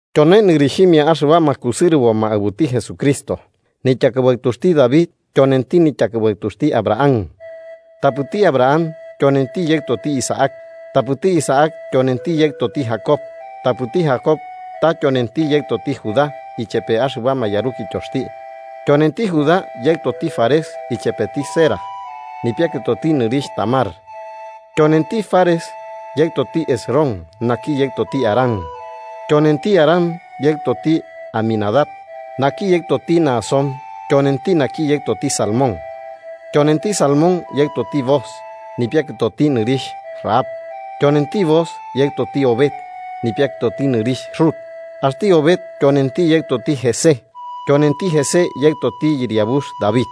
Tyone nɨrixhimia axɨbama kusɨrɨboma aɨbuti Jesucristo, nityakɨbaɨtuxti David tyonenti nityakɨbaɨtuxti Abraham. Tapɨti Abraham yonenti yaɨtoti Isaac, tapɨti Isaac tyonenti yaɨtoti Jacob tapɨti Jacob ta tyonenti yaɨtoti Judá ichepe axɨbama yarukityoxti. Tyonenti Judá yaɨtoti Fares ichepeti Zérah, nipiakɨtoti nɨrixh Tamar. Tyonenti Fares yaɨtoti Hesrón naki yaɨtoti Aram. Tyonenti Aram yaɨtoti Aminadab, naki yaɨtoti Nahasón tyonenti naki yaɨtoti Salmón. Tyonenti Salmón yaɨtoti Booz, nipiakɨtoti nɨrixh Rahab. Tyonenti Booz yaɨtoti Obed, nipiakɨtoti nɨrixh Rut. Axti Obed tyonenti yaɨtoti Jesé, tyonenti Jesé yaɨtoti yɨriabux David.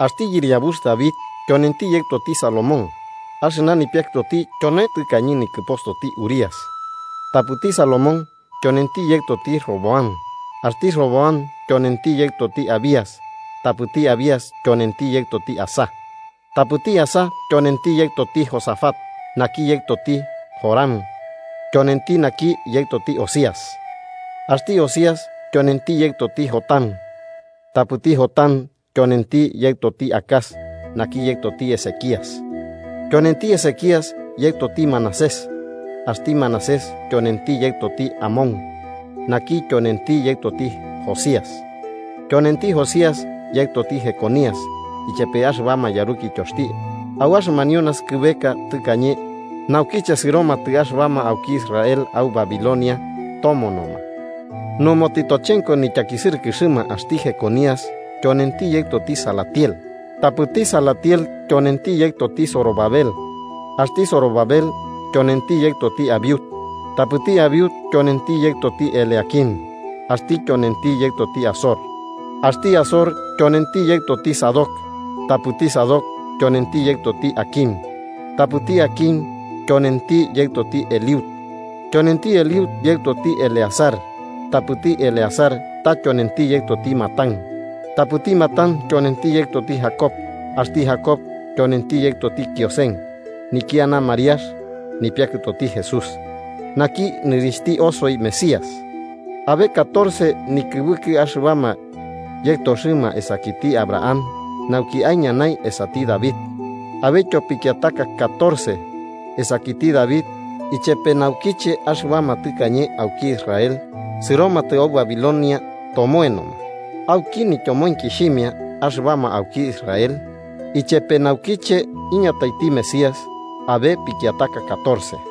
Axti yɨriabux David tyonenti yaɨtoti Salomón, axɨna nipiakɨtoti tyone tɨkañe nikɨpostoti Urías. Tapɨti Salomón tyonenti yaɨtoti Roboam, axti Roboam tyonenti yaɨtoti Abías tapɨti Abías tyonenti yaɨtoti Asá. Tapɨti Asá tyonenti yaɨtoti Josafat, naki yaɨtoti Joram tyonenti naki yaɨtoti Ozías. Axti Ozías tyonenti yaɨtoti Jotam, tapɨti Jotam tyonenti yaɨtoti Acaz naki yaɨtoti Ezequías. Tyonenti Ezequías yaɨtoti Manasés, axti Manasés tyonenti yaɨtoti Amón naki tyonenti yaɨtoti Josías. Tyonenti Josías yaɨtoti Jeconías ichepe axɨbama yarukityoxti, au axɨmanio naskɨbeka tɨkañe naukiche sɨromatɨ axɨbama auki Israel au Babilonia tomonoma. Numo tɨtochenko nityakisɨrɨkɨxɨma axti Jeconías tyonenti yaɨtoti Salatiel, tapɨti Salatiel tyonenti yaɨtoti Zorobabel. Axti Zorobabel tyonenti yaɨtoti Abiud. Tapɨti Abiud tyonenti yaɨtoti Eliaquim, axti tyonenti yaɨtoti Azor. Axti Azor tyonenti yaɨtoti Sadoc, tapɨti Sadoc tyonenti yaɨtoti Aquim, tapɨti Aquim tyonenti yaɨtoti Eliud. Tyonenti Eliud yaɨtoti Eleazar, tapɨti Eleazar ta tyonenti yaɨtoti Matán. Tapɨti Matán tyonenti yaɨtoti Jacob. Axti Jacob tyonenti yaɨtoti Kiosen, nikiana Mariax, nipiakɨtoti Jesús, naki nɨrixhti osoi Mesías. Abe catorce nikɨbɨkɨ axɨbama yaɨtoxɨma esakiti Abraham nauki aiñanai esati David, abetyo pikiataka catorce, esakiti David ichepe naukiche axɨbama tɨkañe auki Israel sɨromatɨ au Babilonia tomoenoma. Auki nityomoenkixhimia axɨbama auki Israel ichepe naukiche iñataiti Mesías abe pikiataka catorce.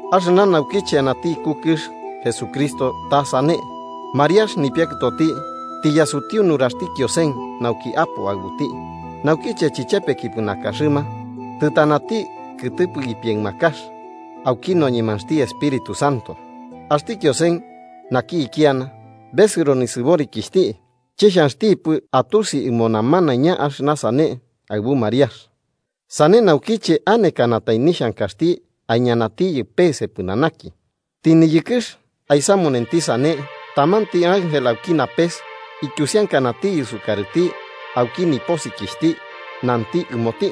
Axɨna naukiche anati iku kɨx Jesucristo ta sane: Mariax nipiakɨtoti tiyasutiu nuraxti Kiosen nauki apo aɨbuti. Naukiche chɨchepekipɨ nakaxɨma, tɨtanati kɨtɨpɨ ipiaɨmakax auki noñemaxti Espíritu Santo. Axti Kiosen, naki ikiana, besɨro nisɨborikixhti chixhanxtipɨ atusi ɨmo namanaiña axɨna sane aɨbu Mariax, sane naukiche anekanatai nixhankaxti aiñanatiyɨ peese pɨnanaki. Tɨniyɨkɨx aisamunenti sane, tamanti ángel auki napes ityusiankanatiyɨ sukarɨti auki ñanukuxti nanti ɨmoti: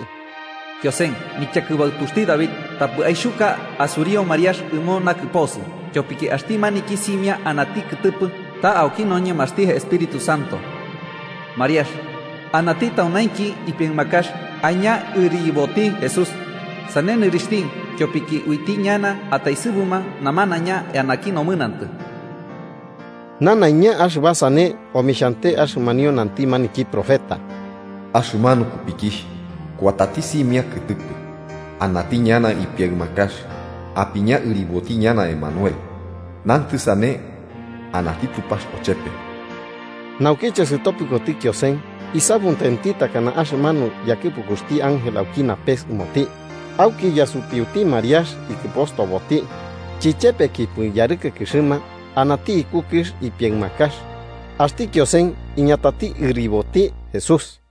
“Kiosen, nityakɨbaɨtuxti David, tapɨ aixhuka asuriu Mariax ɨmo nakɨposɨ, tyopiki axti maniki simia anati kɨtɨpɨ, ta auki noñemaxti Espíritu Santo. Mariax, anati taunainki ipiaɨmakax, aiña ɨriboti Jesús. Sane nɨrixhti ityopiki uiti ñana taesɨburuma namanaiña eanaki nomɨnantɨ.” Nanaiña axɨba sane omixhante axɨmanio nanti maniki profeta: “Axɨmanu kupikixh kuatati simia kɨtɨpɨ anati ñana ipiaɨmakax, apiña ɨriboti ñana Emanuel” (nantɨ sane: “Anati Tupax ochepe”). Naukiche sɨtopɨkoti Kiosen, isamutenti takana axɨmanu yakɨpukuxti ángel auki napes ɨmoti, auki yasutiuti Mariax ikɨpostoboti. Chichepekipɨ yarɨkɨkɨxɨma, anati iku kɨx ipiaɨmakax, axti Kiosen iñatati ɨriboti Jesús.